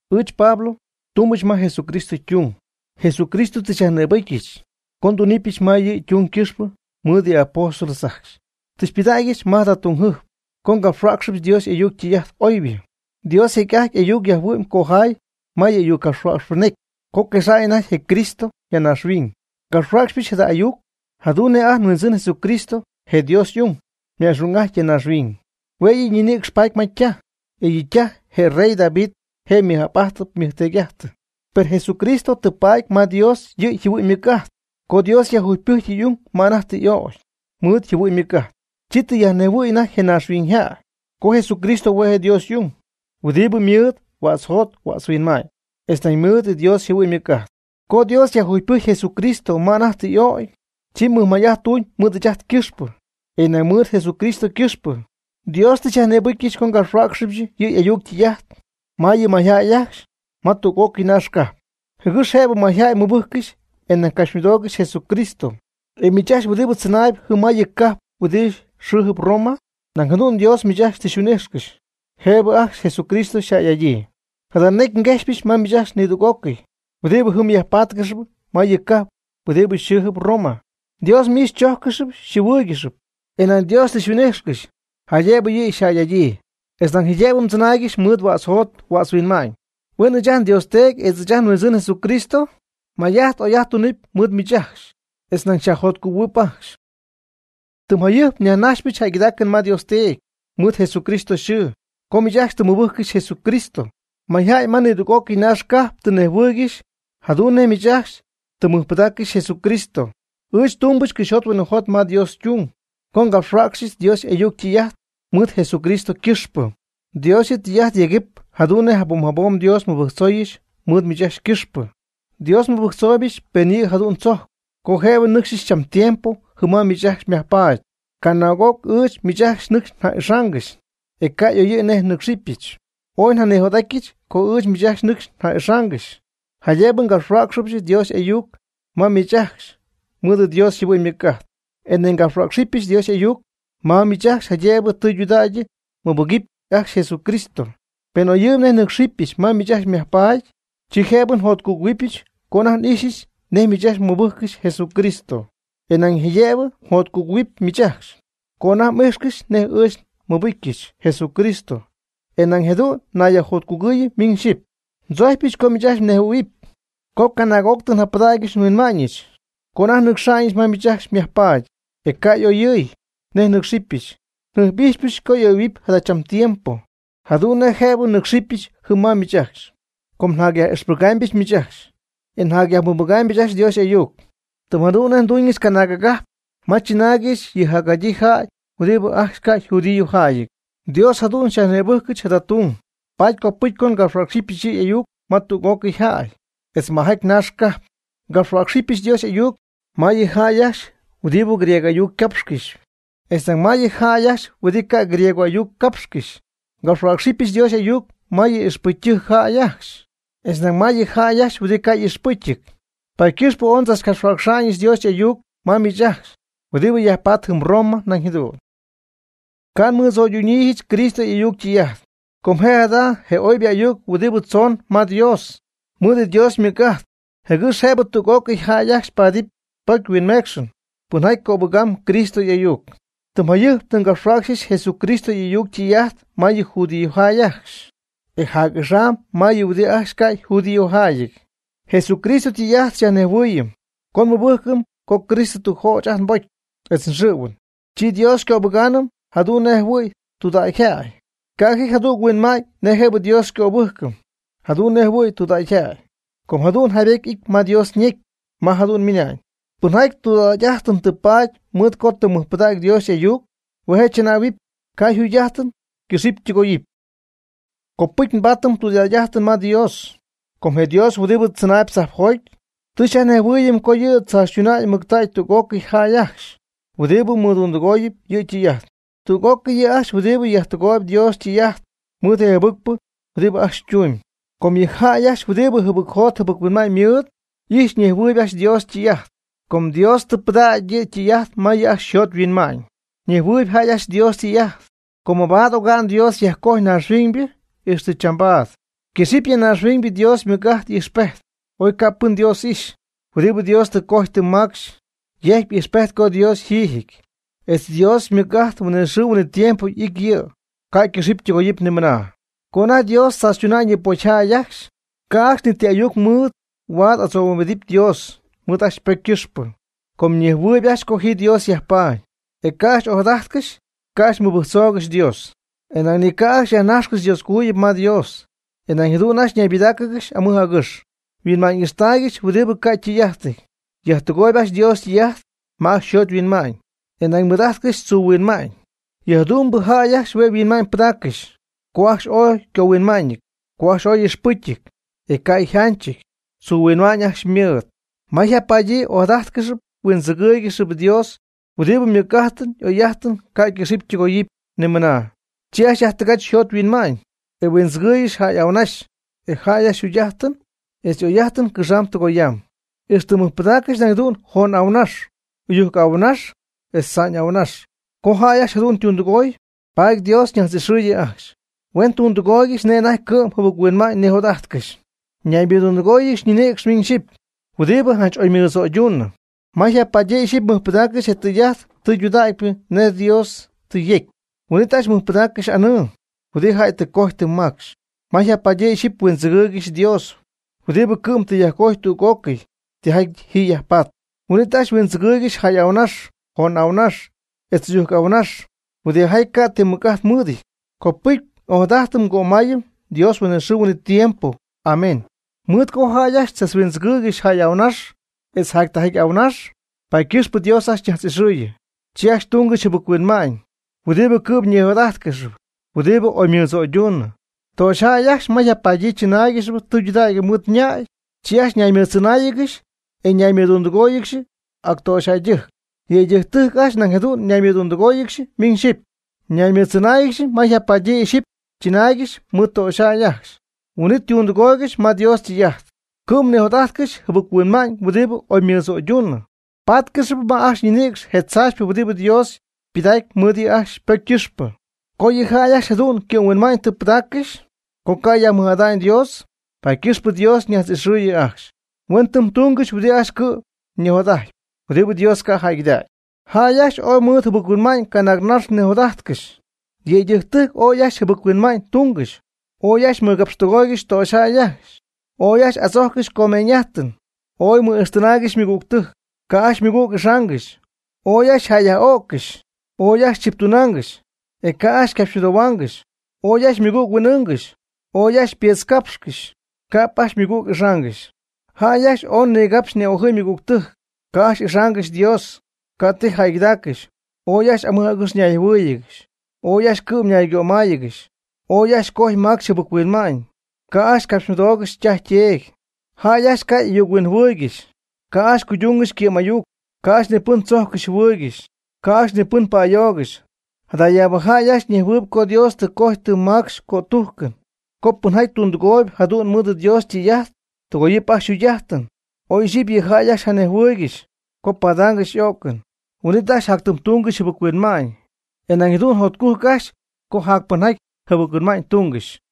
Ɨɨch Pablo tumbɨch ma Jesucristo ytung. Jesucristo tɨ xyajnïbɨcyɨch co nduna'ñɨch ma yɨ' ytung quipxy mɨɨd yɨ' y'apóstol ajcxy. Tɨ xypɨdägyɨch ma jada tung tügjɨjp co ngapxhuäcxɨbɨch Dios y'ayuc ytɨy'ajt oybɨ. Dios jecy'ajty y'ayuc yajhuɨ'my cojay ma yɨ' y'ayucnajtzcapxɨɨybɨ ñecy co quexa'ñ anajty je Cristo ya naaxhuiñ. Ngapxhuäcxyɨch jada ayuc jadu'n nej ajt nHuindzɨn Jesucristo, je Dios y'ung, yma'xung'ajty ya naaxhuiñ. Hue' yɨ' ñinïcx paty ma ytaj. E yɨ' ytaj je rey David je' ymɨj'ap'ajtɨ ymɨjteedy'ajtɨ. Per Jesucristo tɨ paady ma Dios yɨ' yjɨhuɨ'ñ ymɨc'ajt. Co Dios yajjugypɨjcy y'ung ma anajty tɨ y'ögy mɨɨd yjɨhuɨ'ñ ymɨc'ajt, chi tɨ yajnejhuɨ̈y anajty je naaxhuiñyjäy co Jesucristo hue' je' Dios y'ung, huɨdibɨ mɨɨd huädz yjot huädz yhuinma'ñ, etz nañ ymɨɨd Dios yjɨhuɨ'ñ ymɨc'ajt. Co Dios yajjugypɨjcy Jesucristo ma anajty tɨ y'ögy, chi mɨjmay'ajt tuñ mɨɨd ɨɨch ajt ycɨxpɨ. E nañ mɨɨd Jesucristo ycɨxpɨ Dios tɨ xyajnïbɨcyɨch co ngapxhuäcxɨbɨch yɨ' y'ayuc ytɨy'ajt ma yɨ mayjäy ajcxy ma tüg'ócɨy naax cajp, jɨgɨx jëbɨ mayjäy mɨbɨjccɨxy e nañ capxymɨdoogɨxy Jesucristo. E miich ajcxy huɨdibɨ tzɨnaayb jɨm ma yɨ cajp huɨdibɨ xɨɨjɨp Roma, nañ jadu'n Dios miich ajcxy tɨ xyhuin'ijxcɨxy jëbɨ ajcxy Jesucristo xyjäy'adyii. Jada necy nguejxypɨch ma miich ajcxy nidüg'ócɨy huɨdibɨ jɨm yajpatcɨxp ma yɨ cajp huɨdibɨ xɨ́ɨjɨp Roma. Dios miich xychojccɨxp xyjɨhuɨɨygɨxp, e nañ Dios tɨ xyhuin'ijxcɨxy jaydëbɨ yɨ' xyjäy'adyii, etz nañ jaydëbɨ mdzɨnaaygɨxy mɨɨd huädz mjot huädz mhuinma'ñ. Huen ɨɨch ajt nDios Teedy etz ajt nHuindzɨn Jesucristo may'ajt oy'ajt tunɨpy mɨɨd miich ajcxy etz nañ xyajjotcugɨ̈huɨp ajcxy. Tɨm jayɨjp nyajnajxpɨch jäygɨdaacɨn ma Dios, mɨɨd Jesucristo yxɨɨ, co miich ajcxy tɨ mmɨbɨjccɨxy Jesucristo. Mayjäy ma nidüg'ócɨy naax cajp tɨ nejhuɨɨygɨxy jadu'n nej miich ajcxy tɨ mmɨjpɨdaaccɨxy Jesucristo. Ɨɨch tumbɨch cɨxyjot huinɨjot ma Dios ytung, co ngapxhuäcxyɨch Dios y'ayuc ytɨy'ajt mɨɨd Jesucristo ycɨxpɨ. Dios yɨ' tɨy'ajt yegɨp jadu'n nej jabom jabom Dios nmɨbɨjctzooyɨch mɨɨd miich ajcxy ycɨxpɨ. Dios nmɨbɨjctzooybɨch pen yɨ' jadu'n tzojcp co jëbɨ nnɨcxyɨch cham tiempo jɨm ma miich ajcxy myajpaady. Canaag'oc ɨɨch miich ajcxy nɨcxy nja'ixaangɨxy, e ca' y'oyɨ̈y nej nɨ́cxɨbɨch. Ooy njanijot'atyɨch co ɨɨch miich ajcxy nɨcxy n'ixaangɨxy, jaydëbɨ ngapxhuäcxɨbɨch Dios y'ayuc ma miich ajcxy mɨɨd Dios yjɨhuɨ'ñ ymɨc'ajt, e nañ ngapxhuäcxɨbɨch Dios y'ayuc ma miich ajcxy jaydëbɨ tɨydudägy mmɨbɨgɨpy ajcxy Jesucristo. Pen oyɨɨyb nej nɨ́cxɨbɨch ma miich ajcxy myajpaady, chi jëbɨ njotcugɨ̈huɨbyɨch co anajty n'ixyɨch nej miich ajcxy mɨbɨjccɨxy Jesucristo, e nañ jaydëbɨ mjotcugɨ̈huɨpy miich ajcxy co anajty m'ijxcɨxy nej ɨɨch nmɨbɨcyɨch Jesucristo, e jadu'n nayyajjotcugɨɨyɨm miñ xyɨpy. Ndzojcypɨch co miich ajcxy mnejhuɨ̈huɨpy co canaag'oc tɨ njapɨdägyɨch nhuinma'ñɨch co anajty nnɨcxa'ñɨch ma miich ajcxy myajpaady, e ca' y'oyɨ̈y nej nɨ́cxɨbyɨch. Njɨjp'ijxypɨch co oyɨ̈huɨp jadachambɨ tiempo jadu'n nej jëbɨ nnɨ́cxɨbyɨch jɨm ma miich ajcxy. Com njacyaj'ixpɨgaamybɨch miich ajcxy, e nañ njacyajmɨbɨgaamybɨch ajcxy Dios y'ayuc. Tɨm jadu'n nej nduñɨch canaag agajp ma chɨnaaygɨxy yɨ jacjadyii jäy huɨdibɨ ajcxy ca' yjudíojäyɨty. Dios jadu'n xyajnïbɨjcɨch jada tung, paady copɨcy co ngapxhuäcxɨbɨch yɨ' y'ayuc ma tüg'ócɨy jäy, etz majaty naax cajp. Ngapxhuäcxamybɨch Dios y'ayuc ma yɨ jäy ajcxy huɨdibɨ griego ayuc cápxcɨxp, etz ñan ma yɨ jäy ajcxy huɨdibɨ ca' griego y'ayuc capxcɨxy. Ngapxhuäcxamybɨch Dios y'ayuc ma yɨ ixpɨcy jäy ajcxy, etz nañ ma yɨ jäy ajcxy huɨdibɨ ca' y'ixpɨcyɨty. Paady ycɨxpɨ ooy ndzachcapxhuäcxa'ñɨch Dios y'ayuc ma miich ajcxy huɨdibɨ yajpatp jɨm Roma nañ jadu'n. Ca' nmɨdzo'ydunyiijɨch Cristo y'ayuc ytɨy'ajt. Com je' jada je oybɨ ayuc huɨdibɨ tzoon ma Dios, ymɨɨd yɨ' Dios ymɨc'ajt jɨgɨx jëbɨ tüg'ócɨy jäy ajcxy paadɨpy pocy huinmeecxɨn, pɨnjaty cöbɨgaamb Cristo y'ayuc. Tɨm jayɨjp tɨ ngapxhuäcxy Jesucristo y'ayuc ytɨy'ajt ma yɨ judíojäy ajcxy, e jac'axam ma yɨ huɨdibɨ ajcxy ca' yjudíojäyɨty. Jesucristo ytɨy'ajt xyajnejhuɨɨyɨm co nmɨbɨjcɨm co Cristo tɨ jöch ajt nbocy etz nxɨ̈huɨn, chi Dios xycöbɨgaanɨm jadu'n nejjɨhuɨ̈y tudägyjäy. Ca' ji jadüg huinma'ñ nej Dios jëbɨ xycöbɨ́jcɨm jadu'n nej jɨhuɨ̈y tudägyjäy. Com jadu'n jaybety y'ity ma Dios ñecy ma jadu'n ymɨnañ: “Pɨnjaty tudägy'ajtɨn tɨ paady mɨɨd co tɨ mɨjpɨdägy Dios y'ayuc, hue' je' tzɨnähuɨp, ca' yjugy'ajtɨn ycɨxɨpy ytɨgoyɨpy.” Copɨcy nbaatɨm tudägy'ajtɨn ma Dios, com je Dios huɨdibɨ tzɨnaayb tzajpjoty tɨ xyajnejhuɨ́ɨyɨm co yɨ' tzaachytuna'ñ mɨctägy tüg'ócɨy jäy ajcxy huɨdibɨ mɨdundɨgooyb yɨ' ytɨy'ajt, tüg'ócɨy huɨdijaty jɨbɨc huinma'ñ ymɨɨd, tüg'ócɨy yɨ' ajcxy huɨdibɨ yajtɨgooyb Dios ytɨy'ajt mɨɨd je jɨbɨcpɨ huɨdibɨ ajcxy ytumyb. Com yɨ jäy ajcxy huɨdibɨ jɨbɨcjot jɨbɨc-huinma'ñ mɨɨd, y'ijxpy ñejhuɨɨyb ajcxy Dios ytɨy'ajt, com Dios tɨ pɨdägy yɨ' ytɨy'ajt ma yɨ' ajcxy yjot yhuinma'ñ. Ñejhuɨɨyb jäy ajcxy Dios ytɨy'ajt, com mabaad oga'n Dios yajcojy naaxhuiñybɨ ixtɨ chambaad, quëxɨ̈cp ya naaxhuiñ Dios ymɨc'ajt y'ijxpejt, oy ca' pɨn Dios ixy, huɨdibɨ Dios tɨ cojy tɨ macxy yejcpy ijxpejt co Dios yjiijɨty, etz Dios ymɨc'ajt huinɨxɨɨ huinɨtiempo ijtp yɨ', ca' ycɨxɨpy ytɨgoyɨpy nimɨna. Co anajty Dios tzaachytuna'ñ yɨ pocyjäy ajcxy, ca' ajcxy ni ti ayuc mɨɨd huaad adzohuimbidɨp Dios mɨɨd ajcxy ypocy ycɨxpɨ. Com ñejhuɨɨyb ajcxy co ji Dios yajpaady, e ca' ajcxy ojadajtcɨxy ca' ajcxy huindzɨgɨɨygɨxy Dios. E nañ ni ca' ajcxy yajnaxy Dioscojuyip ma Dios. E nañ jadu'n ajcxy ñaybɨdáacɨgɨxy amɨj agɨx, yhuinma'ñ ixtaaygɨxy huɨdibɨ ca' ytɨy'ajtɨty. Yajtɨgooyɨ ajcxy Dios ytɨy'ajt ma ajcxy yjot yhuinma'ñ, e nañ mɨɨd'ajtcɨxy tzuuhuinma'ñ. Yɨ jadu'mbɨ jäy ajcxy hue' yhuinma'ñ pɨdaaccɨxy co ajcxy ooy ycohuinma'ñɨty, co ajcxy ooy y'ixpɨcyɨty, e ca' yjanchɨty, tzuu huinma'ñ ajcxy ymɨɨd. Ma yjapadyii ojadájtcɨxɨpy huindzɨgɨ́ɨygɨxɨpy Dios huɨdibɨ ymɨc'ajtɨn y'oy'ajtɨn ca' ycɨxɨpy ytɨgoyɨpy nimɨna. Chi ajcxy yajtɨgach yjot yhuinma'ñ, e huindzɨgɨɨygɨxy jäy y'ahuɨnax e jäy ajcxy yjugy'ajtɨn etz y'oy'ajtɨn cɨxaamb tɨgoyaamb. Ixtɨ mɨjpɨdaaccɨxy nañ jadu'n joon y'ahuɨnax, ɨyujc y'ahuɨnax etz tza'ñ y'ahuɨnax. Co jäy ajcxy jadu'n ytundɨgoy, paady Dios ñajtz'ixɨɨyɨn ajcxy, huen tundɨgooygɨxy nej anajty cɨ'm jɨbɨchuinma'ñ nijot'ajtcɨxy. Ñaymɨdundɨgóoyɨgɨxy ñinïcx miñ xyɨpy huɨdibɨ janch oy mɨdzo'yduunɨ. Ma yjapadyii ixyipy mɨjpɨdaaccɨxy je tɨy'ajt tɨydudägypɨ nej Dios tɨ yecy, huin'it ajcxy mɨjpɨdaaccɨxy anɨɨ huɨdijaty jäy tɨ cojy tɨ macxy. Ma yjapadyii ixyipy huindzɨgɨɨygɨxy Dios, huɨdibɨ cɨ'm tɨ yajcojtäy tüg'ócɨy tijaty ji yajpaatp, huin'it ajcxy huindzɨgɨɨygɨxy jäy y'ahuɨnax joon y'ahuɨnax, etz ɨyujc y'ahuɨnax huɨdijaty ca' ti mɨc'ajt mɨɨdɨty. Copɨcy n'ojadajtɨm ngömaayɨm Dios huinɨxɨɨ huinɨtiempo. Amén. Mɨɨd co jäy ajcxy tzachhuindzɨgɨɨygɨxy jäy y'ahuɨnax etz jactijaty ahuɨnax, paady ycɨxpɨ Dios ajcxy ñajtz'ixɨ̈yii, chi ajcxy tungɨxy yɨ jɨbɨc-huinma'ñ huɨdibɨ cɨ'm ñijot'ajtcɨxyp huɨdibɨ oy ymɨdzo'yduunɨ. Töxyjäy ajcxy ma yjapadyii chɨnáaygɨxɨpy tudägy mɨɨd ñäy, chi ajcxy ñaymɨɨdtzɨnáayɨgɨxy e ñaymɨɨdtundɨgóoyɨgɨxy actöxyjäydɨjc. Yëydɨjctɨjc ajcxy nañ jadu'n ñaymɨɨdtundɨgóoyɨgɨxy miñ xyɨpy. Ñaymɨɨddzɨnáayɨgɨxy ma yjapadyii iyxipy chɨnaaygɨxy mɨɨd töxyjäy ajcxy, huin'it ytundɨgooygɨxy ma Dios ytɨy'ajt. Cɨ'm nijot'ajtcɨxy jɨbɨc-huinma'ñ huɨdibɨ oymɨdzo'yduunɨ, ypátcɨxɨpy ma ajcxy ñinïcx je tzaachypɨ huɨdibɨ Dios ypɨdacpy mɨɨd yɨ' ajcxy ypocy ycɨxpɨ. Co yɨ jäy ajcxy jadu'n cɨ'm yhuinma'ñ tɨ pɨdaaccɨxy co ca' yajmɨj'ada'ñ Dios, paady ycɨxpɨ Dios ñajtz'ixɨ̈yii ajcxy. Huen tɨm tungɨxy huɨdibɨ ajcxy cɨ'm ñijot'ajtpy, huɨdibɨ Dios ca' jäygɨdägy. Jäy ajcxy ooy mɨj jɨbɨc-huinma'ñ canaagnax nijot'ajtcɨxy; yëydɨjctɨjc ooy ajcxy jɨbɨc-huinma'ñ tungɨxy; ooy ajcxy mɨgapxtɨgoy töxyjäy ajcxy; ooy ajcxy adzojccɨxy comeeñ'ajtɨn; ooy mɨ'ijxtɨnaaygɨxy ymɨgügtɨjc; ca' ajcxy ymɨgüg ixaangɨxy; ooy ajcxy yjäyyaj'öccɨxy; ooy ajcxy chiptunaangɨxy; ca' ajcxy ycapxymɨdohuaangɨxy; ooy ajcxy ymɨgüg huin'ɨɨngɨxy; ooy ajcxy ypiitzcapxcɨxy; ca'p ajcxy ymɨgüg ixaangɨxy. Jäy ajcxy ooy nigapxy ni'ojɨ̈y ymɨgügtɨjc; ca' ajcxy ixaangɨxy Dios; ca' ti jäygɨdaaccɨxy; ooy ajcxy amɨj agɨx ñayjɨhuɨ́ɨyɨgɨxy; ooy ajcxy cɨ'm ñaygömáayɨgɨxy; ooy ajcxy cojy macxy jɨbɨc-huinma'ñ, ca' ajcxy capxymɨdoogɨxy ytaj yteedy. Jäy ajcxy ca' y'ayuc-huinjɨhuɨɨygɨxy; ca' ajcxy cuydungɨxy ycɨ'm'ayuc; ca' ajcxy ni pɨn tzojccɨxy jɨhuɨɨygɨxy; ca' ajcxy ni pɨn pa'ayoogɨxy. Jadayaabɨ jäy ajcxy ñejhuɨɨyb co Dios tɨ cojy tɨ macxy ycötujcɨn co pɨnjaty tundɨgooyb jadu'n mɨɨd Dios ytɨy'ajt, tɨgooyɨp ajcxy yjugy'ajtɨn. Oy iyxipy yɨ jäy ajcxy janejhuɨɨygɨxy co padaangɨxy y'o'cɨn, huin'it ajcxy jactɨmtungɨxy jɨbɨc-huinma'ñ, e nañ jadu'n jotcujc ajcxy co jac pɨnjaty jɨbɨc-huinma'ñ tungɨxy.